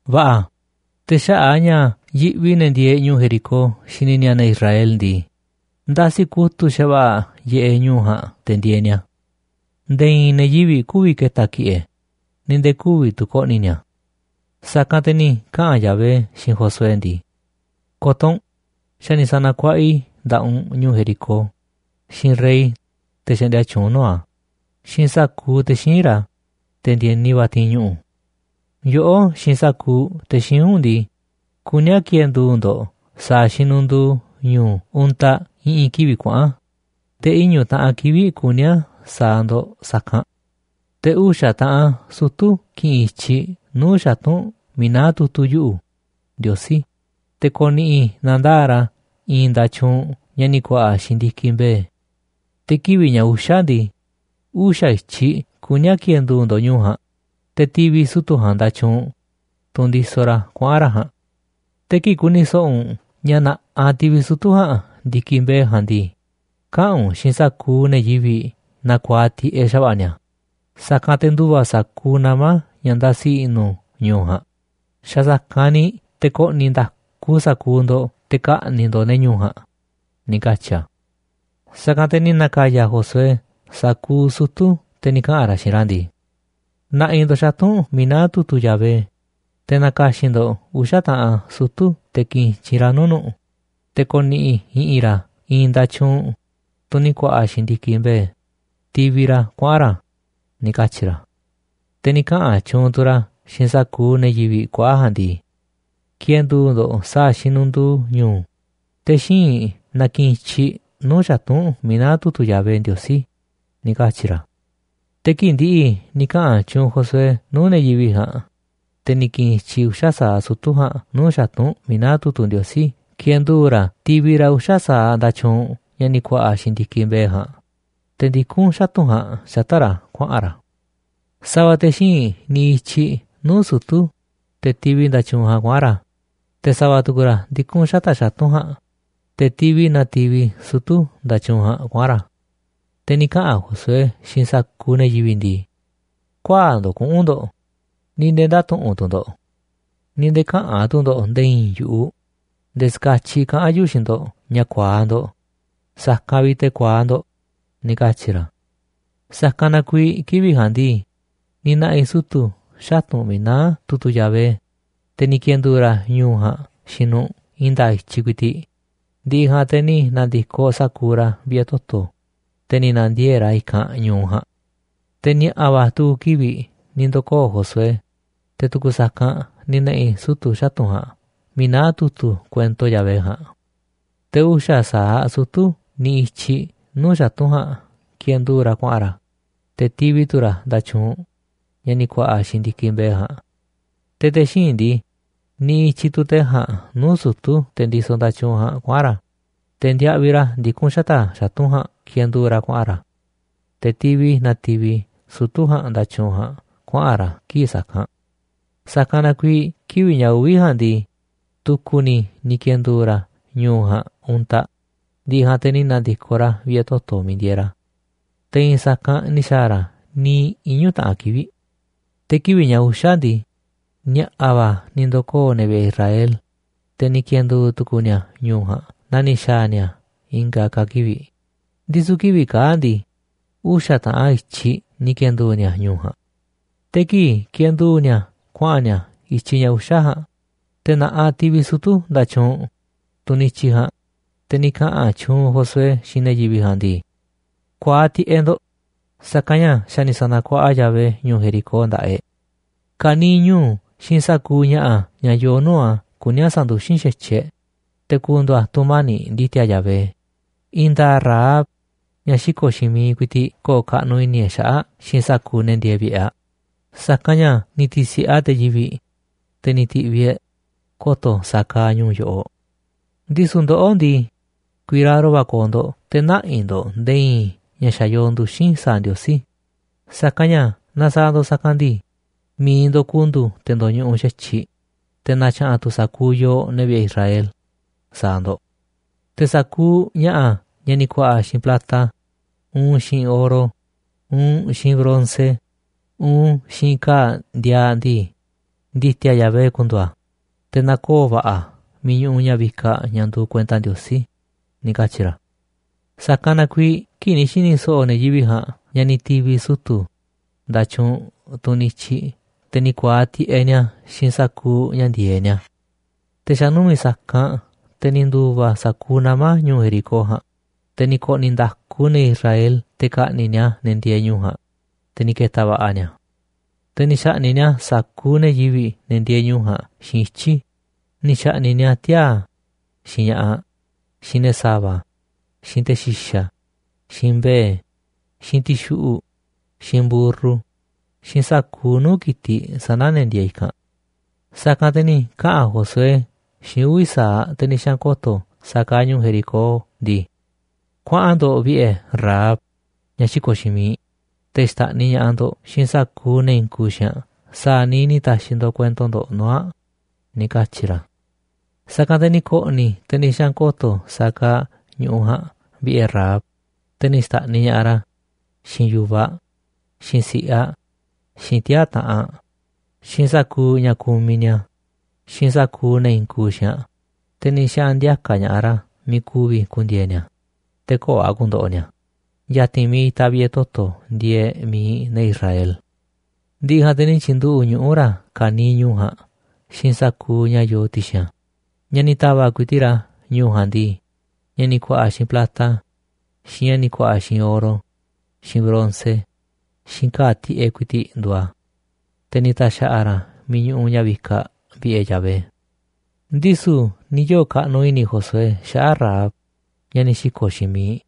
Va̱ꞌa̱, te̱ xaꞌa̱ꞌ a̱ ña̱ yiꞌvi ne̱ ndieeꞌ ñu̱u̱ Jericó xini ni̱a̱ ne̱ Israel ndii, ndasi kutu̱ꞌ xa̱va̱ꞌa̱ yiꞌeꞌ ñu̱u̱ ja̱a̱nꞌ te̱ ndieeꞌ ni̱a̱. Nde̱e̱ i̱i̱n ne̱ yivi̱ꞌ kü̱vi̱ ke̱ta̱ ki̱ꞌe̱ ni̱ nde̱e̱ kü̱vi̱ tu̱ ko̱ꞌni̱ ni̱a̱. Sa̱kanꞌ te̱ ni̱ kaꞌa̱n Yahvé xiinꞌ Josué ndii: ―Ko̱to̱ u̱nꞌ, xa̱ ni̱ sa̱na̱kuaꞌa i̱ nda̱ꞌaꞌ u̱nꞌ ñu̱u̱ Jericó, xiinꞌ rey, te̱ xaꞌndia tyuunꞌ nuu̱ꞌ a̱, xiinꞌ sa̱kuuꞌ te̱ xíinꞌ ra̱, te̱ ndi̱e̱ni va̱ ti̱i̱n ñuꞌu̱. Yoꞌó xiinꞌ sa̱kuuꞌ te̱ xíinꞌ u̱nꞌ ndii, kuní a̱ ki̱e̱ndu̱u̱ ndo̱ꞌ sa̱a̱ xinunduu ñu̱u̱ untaꞌ i̱ꞌi̱n kivi̱ꞌ kuaꞌa̱n, te̱ iñu̱ taꞌan kivi̱ꞌ kuní a̱ sa̱a̱ ndo̱ꞌ sa̱kanꞌ. Te̱ uxa̱ taꞌan sutu̱ ki̱ꞌi̱n i̱tyiꞌ nuu̱ꞌ xatu̱nꞌ miiꞌ naá tu̱tu̱ yuꞌu̱, Ndiosí, te̱ ko̱ꞌni̱ꞌi̱ na̱ndaa̱ꞌ ra̱ i̱i̱n nda̱tyuunꞌ ña̱ ni̱ ku̱a̱ꞌa̱ xiinꞌ ndi̱kiꞌ mbe̱e̱. Te̱ kivi̱ꞌ ña̱ uxa̱ ndii, uxa̱ i̱tyiꞌ kuní a̱ ki̱e̱ndu̱u̱ ndo̱ꞌ ñu̱u̱ ja̱a̱nꞌ, te̱ ti̱vi̱ sutu̱ ja̱a̱nꞌ nda̱tyuunꞌ, tunꞌ ndisoꞌ ra̱ kuaꞌa̱n ra̱ ja̱a̱nꞌ. Te̱ kii̱ꞌ ku̱ni̱ so̱ꞌo̱ u̱nꞌ ña̱ na̱ꞌaꞌ ti̱vi̱ sutu̱ ja̱a̱nꞌ ndi̱kiꞌ mbe̱e̱ ja̱a̱nꞌ ndii, kaꞌa̱n u̱nꞌ xiinꞌ sa̱kuuꞌ ne̱ yivi̱ꞌ na ku̱a̱aꞌ tiꞌeꞌ xa̱va̱ꞌa̱ ni̱a̱, sa̱kanꞌ te̱ ndu̱va̱ sa̱kuuꞌ nama̱ ña̱ ndasi i̱ꞌnu̱ ñu̱u̱ ja̱a̱nꞌ, xa̱ sa̱kanꞌ ni̱ te̱ ko̱ꞌni̱ nda̱ku sa̱kuuꞌ ndo̱ꞌ te̱ ka̱ꞌni̱ꞌ ndo̱ꞌ ne̱ ñu̱u̱ ja̱a̱nꞌ ―ni̱ katyi̱ a̱. Sa̱kanꞌ te̱ ni̱ na̱ka̱ya̱ Josué sa̱kuuꞌ sutu̱, te̱ ni̱ kaꞌa̱n ra̱ xiinꞌ ra̱ ndii: ―Na̱ꞌi̱ ndo̱ꞌ xatu̱nꞌ miiꞌ naá tu̱tu̱ Yahvé, te̱ na̱ka̱xi̱n ndo̱ꞌ uxa̱ taꞌan sutu̱ te̱ ki̱ꞌi̱n i̱tyiꞌ nuu̱ꞌ nu̱ꞌ, te̱ ko̱ni̱ꞌi̱ i̱ꞌi̱n ra̱ i̱i̱n nda̱tyuunꞌ, tunꞌ ni̱ ku̱a̱ꞌa̱ xiinꞌ ndi̱kiꞌ mbe̱e̱, tivi ra̱ kuaꞌa̱n ra̱ ―ni̱ katyi̱ ra̱. Te̱ ni̱ kaꞌa̱n tyuunꞌ tu̱ ra̱ xiinꞌ sa̱kuuꞌ ne̱ yivi̱ꞌ kuaꞌa̱ ja̱a̱nꞌ ndii: ―Ki̱e̱ndu̱u̱ ndo̱ꞌ sa̱a̱ xinunduu ñu̱u̱, te̱ xíinꞌ na ki̱ꞌi̱n i̱tyiꞌ nuu̱ꞌ xatu̱nꞌ miiꞌ naá tu̱tu̱ Yahvé Ndiosí ―ni̱ katyi̱ ra̱. Te̱ kii̱ꞌ ndi̱ꞌi̱ ni̱ kaꞌa̱n tyuunꞌ Josué nuu̱ꞌ ne̱ yivi̱ꞌ ja̱a̱nꞌ, te̱ ni̱ ki̱ꞌi̱n i̱tyiꞌ uxa̱ sa̱aꞌ sutu̱ ja̱a̱nꞌ nuu̱ꞌ xatu̱nꞌ miiꞌ naá tu̱tu̱ Ndiosí kiendu̱u̱ ra̱ tivi ra̱ uxa̱ sa̱aꞌ nda̱tyuunꞌ ña̱ ni̱ ku̱a̱ꞌa̱ xiinꞌ ndi̱kiꞌ mbe̱e̱ ja̱a̱nꞌ, te̱ ndikún xatu̱nꞌ ja̱a̱nꞌ xata̱ꞌ ra̱ kuaꞌa̱n ra̱. Sa̱va̱ te̱ xíinꞌ niꞌiꞌ i̱tyiꞌ nuu̱ꞌ sutu̱, te̱ tivi nda̱tyuunꞌ ja̱a̱nꞌ kuaꞌa̱n ra̱, te̱ sa̱va̱ tu̱ku̱ ra̱ ndi̱kun xata̱ꞌ xatu̱nꞌ ja̱a̱nꞌ, te̱ tivi na tivi sutu̱ nda̱tyuunꞌ ja̱a̱nꞌ kuaꞌa̱n ra̱. Te̱ ni̱ kaꞌa̱n Josué xiinꞌ sa̱kuuꞌ ne̱ yivi̱ꞌ ndii: ―Ku̱ä̱aꞌ ndo̱ꞌ kuꞌu̱n ndo̱ꞌ, ni̱ nde̱e̱ ndä̱tuꞌunꞌ tu̱ ndo̱ꞌ, ni̱ nde̱e̱ käꞌa̱n tu̱ ndo̱ꞌ nde̱e̱ i̱i̱n yu̱ꞌuꞌ nde̱e̱ ska̱tyiꞌ kaꞌa̱n yuꞌu̱ xiinꞌ ndo̱ꞌ ña̱ ku̱a̱aꞌ ndo̱ꞌ, sa̱kanꞌ vi̱ꞌ te̱ ku̱a̱aꞌ ndo̱ꞌ ―ni̱ katyi̱ ra̱. Sa̱kanꞌ na kuiiꞌ kivi̱ꞌ ja̱a̱nꞌ ndii, ni̱ na̱ꞌi̱ sutu̱ xatu̱nꞌ miiꞌ naá tu̱tu̱ Yahvé, te̱ ni̱ ki̱e̱ndu̱u̱ ra̱ ñu̱u̱ ja̱a̱nꞌ xiinꞌ nu̱ꞌ i̱i̱n nda̱a̱ꞌ i̱tyiꞌ ku̱i̱ti̱ꞌ, ndi̱ꞌi̱ ja̱a̱nꞌ te̱ ni̱ na̱ndi̱koꞌ sa̱kuuꞌ ra̱ vi̱ꞌe̱ toto̱, te̱ ni̱ na̱ndiee̱ꞌ ra̱ i̱kanꞌ ñu̱u ja̱a̱nꞌ. Te̱ ni̱a̱ꞌa̱ va̱ tu̱ku̱ kivi̱ꞌ ni̱ ndo̱koo̱ Josué, te̱ tu̱ku̱ sa̱kanꞌ ni̱ na̱ꞌi̱ sutu̱ xatu̱nꞌ ja̱a̱nꞌ miiꞌ naá tu̱tu̱ kuento Yahvé ja̱a̱nꞌ. Te̱ uxa̱ sa̱aꞌ sutu̱ niꞌiꞌ i̱tyiꞌ nuu̱ꞌ xatu̱nꞌ ja̱a̱nꞌ kiendu̱u̱ ra̱ kuaꞌa̱n ra̱, te̱ tivi tu̱ ra̱ nda̱tyuunꞌ ña̱ ni̱ ku̱a̱ꞌa̱ xiinꞌ ndi̱kiꞌ mbe̱e̱ ja̱a̱nꞌ. Te̱ te̱ xíinꞌ ndii, niꞌiꞌ i̱tyiꞌ tu̱ te̱ ja̱a̱nꞌ nuu̱ꞌ sutu̱, te̱ ndisoꞌ nda̱tyuunꞌ ja̱a̱nꞌ, kuaꞌa̱n ra̱, te̱ ndiaꞌviꞌ ra̱ ndikún xata̱ꞌ xatu̱nꞌ ja̱a̱nꞌ kiendu̱u̱ ra̱ kuaꞌa̱n ra̱. Te̱ tivi na tivi sutu̱ ja̱a̱nꞌ nda̱tyuunꞌ ja̱a̱nꞌ kuaꞌa̱n ra̱ kii̱ꞌ sa̱kanꞌ. Sa̱kanꞌ na kuiiꞌ kivi̱ꞌ ña̱ uvi̱ ja̱a̱nꞌ ndii, tu̱ku̱ ni̱ ni̱ ki̱e̱ndu̱u̱ ra̱ ñu̱u̱ ja̱a̱nꞌ untaꞌ, ndi̱ꞌi̱ ja̱a̱nꞌ te̱ ni̱ na̱ndi̱koꞌ ra̱ vi̱ꞌe̱ toto̱ miiꞌ ndieeꞌ ra̱. Te̱ i̱i̱n sa̱kanꞌ ni̱ xa̱a̱ ra̱ niiꞌ iñu̱ taꞌan kivi̱ꞌ. Te̱ kivi̱ꞌ ña̱ uxa̱ ndii, ni̱a̱ꞌa̱ va̱ ni̱ ndo̱koo̱ ne̱ vi̱ꞌe̱ Israel, te̱ ni̱ ki̱e̱ndu̱u̱ tu̱ku̱u̱ ni̱a̱ ñu̱u̱ ja̱a̱nꞌ naa ni̱ xa̱a̱ ni̱a̱ i̱nga̱ ka̱ kivi̱ꞌ, ndisu̱ kivi̱ꞌ kaa̱ꞌ ndii, uxa̱ taꞌan i̱tyiꞌ ni̱ ki̱e̱ndu̱u̱ ni̱a̱ ñu̱u̱ ja̱a̱nꞌ. Te̱ kii̱ꞌ kiendu̱u̱ ni̱a̱ kuaꞌa̱n ni̱a̱ i̱tyiꞌ ña̱ uxa̱ ja̱a̱nꞌ, te̱ na̱ꞌaꞌ tivi sutu̱ nda̱tyuunꞌ, tunꞌ niꞌiꞌ i̱tyiꞌ ja̱a̱nꞌ, te̱ ni̱ kaꞌa̱n tyuunꞌ Josué xiinꞌ ne̱ yivi̱ꞌ ndii: ―Ku̱a̱aꞌ tiꞌeꞌ ndo̱ꞌ, sa̱kanꞌ ña̱ xa̱ ni̱ sa̱na̱kuaꞌa Yahvé ñu̱u̱ Jericó nda̱ꞌaꞌ e̱ꞌ. Ka̱niiꞌ ñu̱u̱ xiinꞌ sa̱kuuꞌ ña̱ꞌa̱ ña̱ yoo nuu̱ꞌ a̱ kuní a̱ sa̱nduxín xa̱tyiꞌ e̱ꞌ, te̱ ku̱ndu̱u̱ a̱ tu̱mani̱ꞌ ndi̱ti̱a̱ Yahvé. I̱i̱n nda̱a̱ꞌ Rahab, ñaꞌ xiko̱ꞌ xiinꞌ miiꞌ, ku̱i̱ti̱ꞌ ko̱o̱ kaꞌnuꞌ i̱ni̱ e̱ꞌ xaꞌa̱ꞌ xiinꞌ sa̱kuuꞌ ne̱ ndieeꞌ vi̱ꞌe̱ aꞌ, sa̱kanꞌ ña̱ ni̱ ti̱si̱ꞌe aꞌ te̱ yivi̱ꞌ, te̱ ni̱ ti̱ꞌviꞌ e̱ꞌ ko̱to̱ sa̱a̱ kaaꞌ ñu̱ꞌuꞌ yoꞌoꞌ. Ndisu̱ ndoꞌó ndii, ku̱i̱raro va̱ ko̱o̱ ndo̱ꞌ te̱ nä̱ꞌi̱ ndo̱ꞌ nde̱e̱ i̱i̱n ña̱ xa̱ yoo nduxi̱n sa̱a̱ Ndiosí, sa̱kanꞌ ña̱ naaꞌ sa̱a̱ ndo̱ꞌ sa̱kanꞌ ndii, mi̱iꞌ ndo̱ꞌ ku̱ndu̱u̱ te̱ ndo̱ñuꞌuꞌ xa̱tyiꞌ, te̱ na̱tya̱ꞌa̱n tu̱ sa̱kuuꞌ yooꞌ, ne̱ vi̱ꞌe̱ Israel, sa̱a̱ ndo̱ꞌ. Te̱ sa̱kuuꞌ ña̱ꞌa̱ ña̱ ni̱ ku̱a̱ꞌa̱ xiinꞌ plata, uun xiinꞌ oro, uun xiinꞌ bronce, uun xiinꞌ ka̱a̱ ndiaaꞌ ndii, ndi̱ti̱a̱ Yahvé ku̱ndu̱u̱ a̱, te̱ na̱koo̱ va̱ꞌa̱ a̱ miiꞌ ñuꞌuꞌ ña̱ vikaꞌ ña̱ nduuꞌ kuenta Ndiosí ―ni̱ katyi̱ ra̱. Sa̱kanꞌ na kuiiꞌ kii̱ꞌ ni̱ xi̱ni̱ so̱ꞌo̱ ne̱ yivi̱ꞌ ja̱a̱nꞌ ña̱ ni̱ ti̱vi̱ sutu̱ nda̱tyuunꞌ, tunꞌ niꞌiꞌ i̱tyiꞌ, te̱ ni̱ ku̱a̱aꞌ tiꞌeꞌ ni̱a̱ xiinꞌ sa̱kuuꞌ ña̱ ndi̱e̱eꞌ ni̱a̱. Te̱ xa̱ numi̱ꞌ sa̱kanꞌ, te̱ ni̱ ndu̱va̱ sa̱kuuꞌ nama̱ ñu̱u̱ Jericó ja̱a̱nꞌ, te̱ ni̱ ko̱ꞌni̱ nda̱ku ne̱ Israel te̱ ka̱ꞌni̱ꞌ ni̱a̱ ne̱ ndieeꞌ ñu̱u̱ ja̱a̱nꞌ, te̱ ni̱ ke̱ta̱ va̱ꞌa̱ ni̱a̱. Te̱ ni̱ xa̱ꞌni̱ꞌ ni̱a̱ sa̱kuuꞌ ne̱ yivi̱ꞌ, ne̱ ndieeꞌ ñu̱u̱ ja̱a̱nꞌ, xiinꞌ ityi̱, ni̱ xa̱ꞌni̱ꞌ ni̱a̱ tiaa̱, xiinꞌ ña̱ꞌaꞌ, xiinꞌ ne̱ sa̱va̱, xiinꞌ te̱ xi̱xa̱, xiinꞌ mbe̱e̱, xiinꞌ ti̱xuꞌu̱ꞌ, xiinꞌ mburru, xiinꞌ sa̱kuuꞌ nuu̱ꞌ ki̱tiꞌ sana̱ ne̱ ndieeꞌ i̱kanꞌ. Sa̱kanꞌ te̱ ni̱ kaꞌa̱n Josué xiinꞌ uvi̱ sa̱aꞌ te̱ ni̱ xaꞌa̱n ko̱to̱ sa̱a̱ kaaꞌ ñu̱u̱ Jericó ndii: ―Kuaꞌan ndo̱ꞌ vi̱ꞌe̱ Rahab, ñaꞌ xiko̱ꞌ xiinꞌ miiꞌ, te̱ xta̱ꞌniꞌ ña̱ꞌaꞌ ndo̱ꞌ xiinꞌ sa̱kuuꞌ ne̱ i̱i̱n kuuꞌ xiinꞌ aꞌ sa̱a̱ niiꞌ ni̱ ta̱xi̱ ndo̱ꞌ kuento ndo̱ꞌ nuu̱ꞌ aꞌ ―ni̱ katyi̱ ra̱. Sa̱kanꞌ te̱ ni̱ ko̱ꞌni̱ te̱ ni̱ xaꞌa̱n ko̱to̱ sa̱a̱ kaaꞌ ñu̱ꞌuꞌ ja̱a̱nꞌ vi̱ꞌe̱ Rahab, te̱ ni̱ xta̱ꞌniꞌ ña̱ꞌaꞌ ra̱, xiinꞌ yu̱vaꞌ aꞌ, xiinꞌ si̱ꞌiꞌ aꞌ, xiinꞌ tiaa̱ taꞌanꞌ aꞌ, xiinꞌ sa̱kuuꞌ ña̱ kumiꞌ ni̱a̱, xiinꞌ sa̱kuuꞌ ne̱ i̱i̱n kuuꞌ xiinꞌ aꞌ, te̱ ni̱ xaꞌa̱n ndi̱a̱ka̱ ña̱ꞌaꞌ ra̱ miiꞌ ku̱vi̱ ku̱ndi̱e̱e̱ ni̱a̱, te̱ köo̱ꞌ a̱ ku̱ndo̱ꞌo̱ ni̱a̱, ya̱ti̱n miiꞌ itaꞌ vi̱ꞌe̱ toto̱ ndieeꞌ mi̱iꞌ ne̱ Israel. Ndi̱ꞌi̱ ja̱a̱nꞌ te̱ ni̱ tyi̱nduꞌu̱ꞌ ñuꞌu̱ ra̱ ka̱niiꞌ ñu̱u̱ ja̱a̱nꞌ xiinꞌ sa̱kuuꞌ ña̱ yoo ti̱xi̱n a̱. Ña̱ ni̱ ta̱va̱ꞌ ku̱i̱ti̱ꞌ ra̱ ñu̱u̱ ja̱a̱nꞌ ndii, ña̱ ni̱ ku̱a̱ꞌa̱ xiinꞌ plata, xiinꞌ ña̱ ni̱ ku̱a̱ꞌa̱ xiinꞌ oro, xiinꞌ bronce, xiinꞌ ka̱a̱ tiꞌeꞌ ku̱i̱ti̱ꞌ nduuꞌ a̱, te̱ ni̱ ta̱xa̱ꞌa̱ ra̱ a̱ miiꞌ ñuꞌuꞌ ña̱ vikaꞌ vi̱ꞌe̱ Yahvé. Ndisu̱ ni̱ yoo̱ kaꞌnuꞌ i̱ni̱ Josué xaꞌa̱ꞌ Rahab, ñaꞌ ni̱ xi̱ko̱ꞌ xiinꞌ miiꞌ,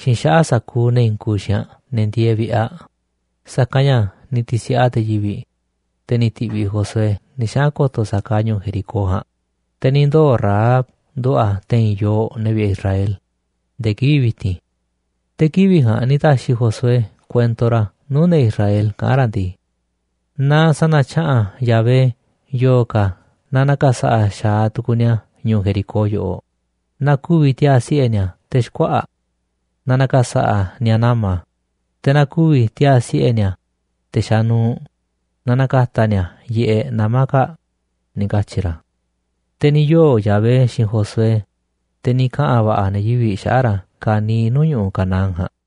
xiinꞌ xaꞌa̱ꞌ sa̱kuuꞌ ne̱ i̱i̱n kuuꞌ xiinꞌ aꞌ, ne̱ ndieeꞌ vi̱ꞌe̱ aꞌ, sa̱kanꞌ ña̱ ni̱ ti̱si̱ꞌe aꞌ te̱ yivi̱, te̱ ni̱ ti̱ꞌviꞌ Josué ni̱ xaꞌa̱n ko̱to̱ sa̱a̱ kaaꞌ ñu̱u̱ Jericó ja̱a̱nꞌ. Te̱ ni̱ ndoo̱ Rahab nduꞌu̱ꞌ aꞌ te̱i̱n yooꞌ, ne̱ vi̱ꞌe̱ Israel, nde̱e̱ kivi̱ꞌ vi̱ti̱n. Te̱ kivi̱ꞌ ja̱a̱nꞌ ni̱ ta̱xi̱ Josué kuento ra̱ nuu̱ꞌ ne̱ Israel kaꞌán ra̱ ndii: ―Na sa̱na̱tya̱ꞌa̱n Yahvé yo̱o̱ ka̱ naaꞌ na̱ka̱sa̱ꞌa̱ xa̱aꞌ tu̱ku̱u̱ ni̱a̱ ñu̱u̱ Jericó yoꞌoꞌ, na ku̱vi̱ tiaa̱ siꞌe̱ ni̱a̱ te̱ xkuaꞌa̱ꞌ, naaꞌ na̱ka̱sa̱ꞌa̱ ni̱a̱ nama̱, te̱ na ku̱vi̱ tiaa̱ siꞌe̱ ni̱a̱, te̱ xanuuꞌ, naaꞌ na̱ka̱ta̱ ni̱a̱ yiꞌeꞌ nama̱ kaa̱ꞌ ―ni̱ katyi̱ ra̱. Te̱ ni̱ yoo̱ Yahvé xiinꞌ Josué, te̱ ni̱ kaꞌa̱n va̱ꞌa̱ ne̱ yivi̱ꞌ xaꞌa̱ꞌ ra̱ ka̱niiꞌ nuu̱ꞌ ñu̱ꞌuꞌ Canaán ja̱a̱nꞌ.